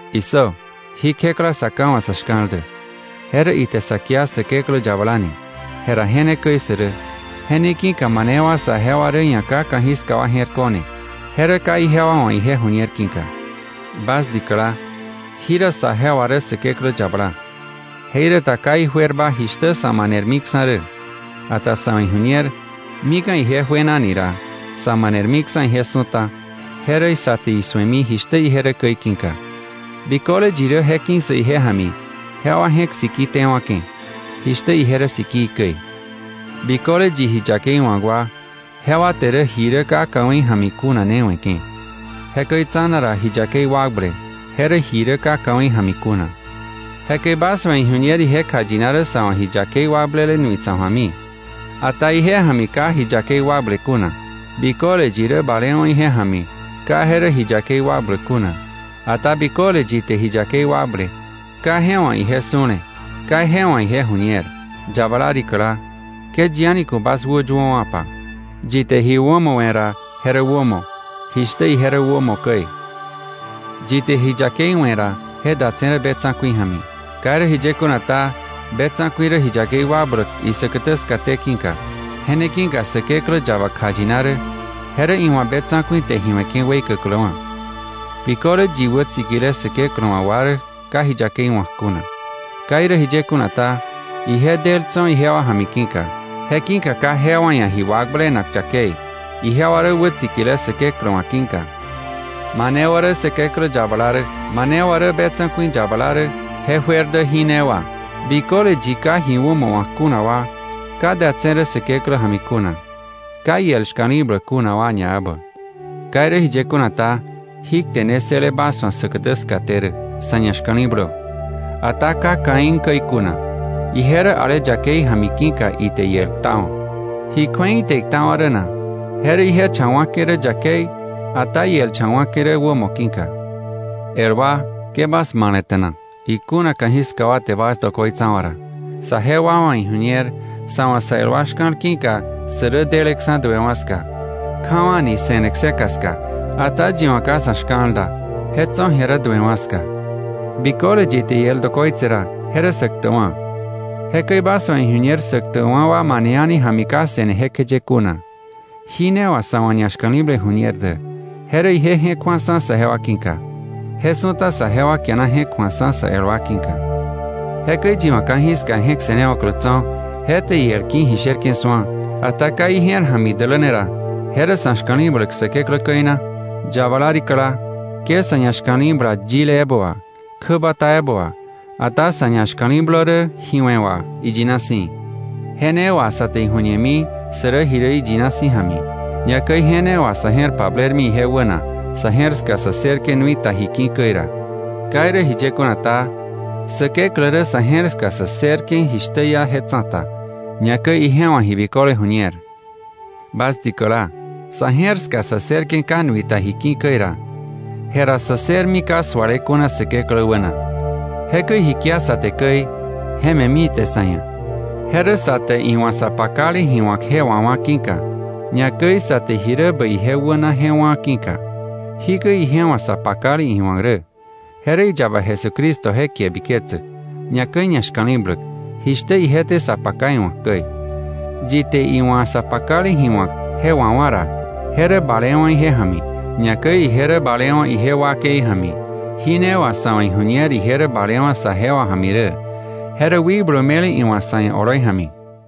¡Issö! Jí kjekla Sa Ká wa̱ sa̱ shka̱l dä, je rä ite sa kia Säkeklä yabala ni. Je ra je ne käi sä rä. Je ne ki̱ka mane wa saje wa rä ia̱ ka ka̱jiska wa je̱r ko̱ne, je rä ka ijewa wa̱ ije ju̱ñer ki̱ka. Bas dikäla, jira sajewa rä Säkeklä yabala. Jeiräta ka ijuerba jishtä sa̱ manermiksa̱ rä; ata sa̱ wa̱ iju̱ñer, mika̱ ije juena ni ra, sa̱ manermiksa̱ ije su̱ta, je rä sa te isu̱emi jishtä ije rä käi ki̱ka. Biköle yi rä je ki̱ssäk ije ja̱mi, jewa je̱k siki tewa̱ke̱, jishtä ije rä sikii käi. Biköle yi ji yakei wa̱k wa, jewa te rä ji rä ka ka̱wei ja̱mi kuna ne we̱ke̱. Jekäi tsa̱na ra ji yakei wakble, je rä ji rä ka ka̱wei ja̱mi kuna. Jekäi bas wa̱ iju̱ñer ije kjayina rä sa̱ wa̱ ji yakei wakblele nui tsa̱k ju̱ami; ata ije ja̱mi ka ji yakei wakble kuna. Biköle yi rä balewa̱ ije ja̱mi, ka je rä ji yakei wakbläk kuna. Ata biköle yi te ji yakei wakble, ka je wa̱ ije su̱le, ka je wa̱ ije ju̱ñer. Yabala rikäla, ke yi a̱ni ku̱ bas wäyuöwa̱pa. Yi te ji wämo we̱ ra, je rä wämo, jishtä ije rä wämo käi. Yi te ji yakei we̱ ra, je datse̱ rä be tsa̱ku̱i ja̱mi. Ka irä jiye kuna ta, be tsa̱ku̱i rä ji yakei wakbläk isäkätä skaté ki̱ka. Je ne ki̱ka Säkeklä yaba kjayina rä, je rä iwa̱ be tsa̱ku̱i te ji we̱ke̱ weikäkläwa̱. Biköle yi wätsikile Säkeklä wa̱ wa rä ka ji yakei wa̱k kuna. Ka irä jiye kuna ta, ije del tso̱ ijewa ja̱mi ki̱ka. Je ki̱ka ka jewa ia̱ ji wakblenak yakei, ijewa rä wätsikile Säkeklä wa̱ ki̱ka. Mane wa rä Säkeklä yabala rä, mane wa rä be tsa̱ku̱i yabala rä, je juer dä jí ne wà: Biköle yi ka ji wämo wa̱k kuna wa, ka datse̱ rä Säkeklä ja̱mi kuna, ka iel shka̱li̱bläk kuna wa ñaebä. Ka irä jiye kuna ta, jí kte ne ssële bas wa̱ säkätä skaté rä: Sa̱ ñashka̱li̱blö, ata ka Caín käi kuna; ije rä ale yakei ja̱mi ki̱ka ite iel ktawa̱. ¿Ji kju̱ei ite iktawa̱ rä na? Je rä ije cha wa̱ke̱ rä yakei, ata iel cha wa̱ke̱ rä wämo ki̱ka. El wa, ke bas male̱te̱na, ikuna ka̱jiska wa te bas dokoitsawa̱ ra. Saje wa wa̱ iju̱ñer, sa̱ wa̱ sa el wa shka̱l ki̱ka, sä rä deleksa̱ duewa̱ ska, kjawa̱ni se̱ne kseka ska. Ata yi wa̱ ka sa̱ shka̱l da, je tso̱ ji̱a rä duewa̱ ska. Biköle yi te iel dokoitse ra, je rä sä ktäkwa̱. Jekäi bas wa̱ iju̱ñer sä ktäkwa̱ wa mane a̱ni ja̱mi ka se̱ne jekjeye kuna. Jí ne wà sa̱ wa̱ ñashka̱li̱ble ju̱ñer dä: Je rä ije je̱k ju̱aksa̱ saje wa ki̱ka. Je su̱ta saje wa kiana je̱k ju̱akksa̱ sä el wa ki̱ka. Jekäi yi wa̱ ka̱jiska je̱k se̱newa̱klä tso̱, je te iel ki̱ ji sherke̱ su̱a, ata ka ije̱r ja̱mi idäläne ra, ¿je rä sa̱ shka̱li̱bläk Säkeklä käi na? Yabala rikäla, ke sa̱ ñashka̱li̱bla yile ebä wà, kjäbata ebä wà, ata sa̱ ñashka̱li̱blö rä ji we̱ wà, iyina si̱. Je ne wà sa te iju̱ñemi sä rä ji rä iyina si̱ ja̱mi, ñakäi je ne wà sa̱ je̱r pablermi ije wäna, sa̱ je̱r ska sä ssërke̱ nui ta ji ki̱ käi ra. Ka irä jiye kuna ta, Säkeklä rä sa̱ je̱r ska sä ssërke̱ jishtä iá je tsa̱ta, ñakäi ije wa̱ ji biköle ju̱ñer. Bas dikäla, sa̱ je̱r ska sä ssërke̱ ka nui ta ji ki̱ käi ra, jera sä ssërmi ka sualewa̱ kuna Säkeklä wäna. Jekäi ji kia sa te käi, je me̱mi ite sa̱ ia̱. Je rä sa te iwa̱ sa pakale ji wa̱k je wawá̱ ki̱ka, ñakäi sa te ji rä bäi ije wäna je wá̱ ki̱ka. Jikäi ije wa̱ sa pakale iwa̱k rä: Je rä iyaba Jesucristo je kie biketsäk, ñakäi ñashka̱li̱bläk, jishtä ije te sa paka iwa̱k käi. Yi te iwa̱ sa pakale ji wa̱k je wawá̱ ra, je rä balewa̱ ije ja̱mi, ñakäi ije rä balewa̱ ije wakei ja̱mi. Ji ne wà sa̱ wa̱ iju̱ñer ije rä balewa̱ saje wa ja̱mi rä: je rä wikblu me̱le iwa̱ sa̱ ia̱ oloi ja̱mi.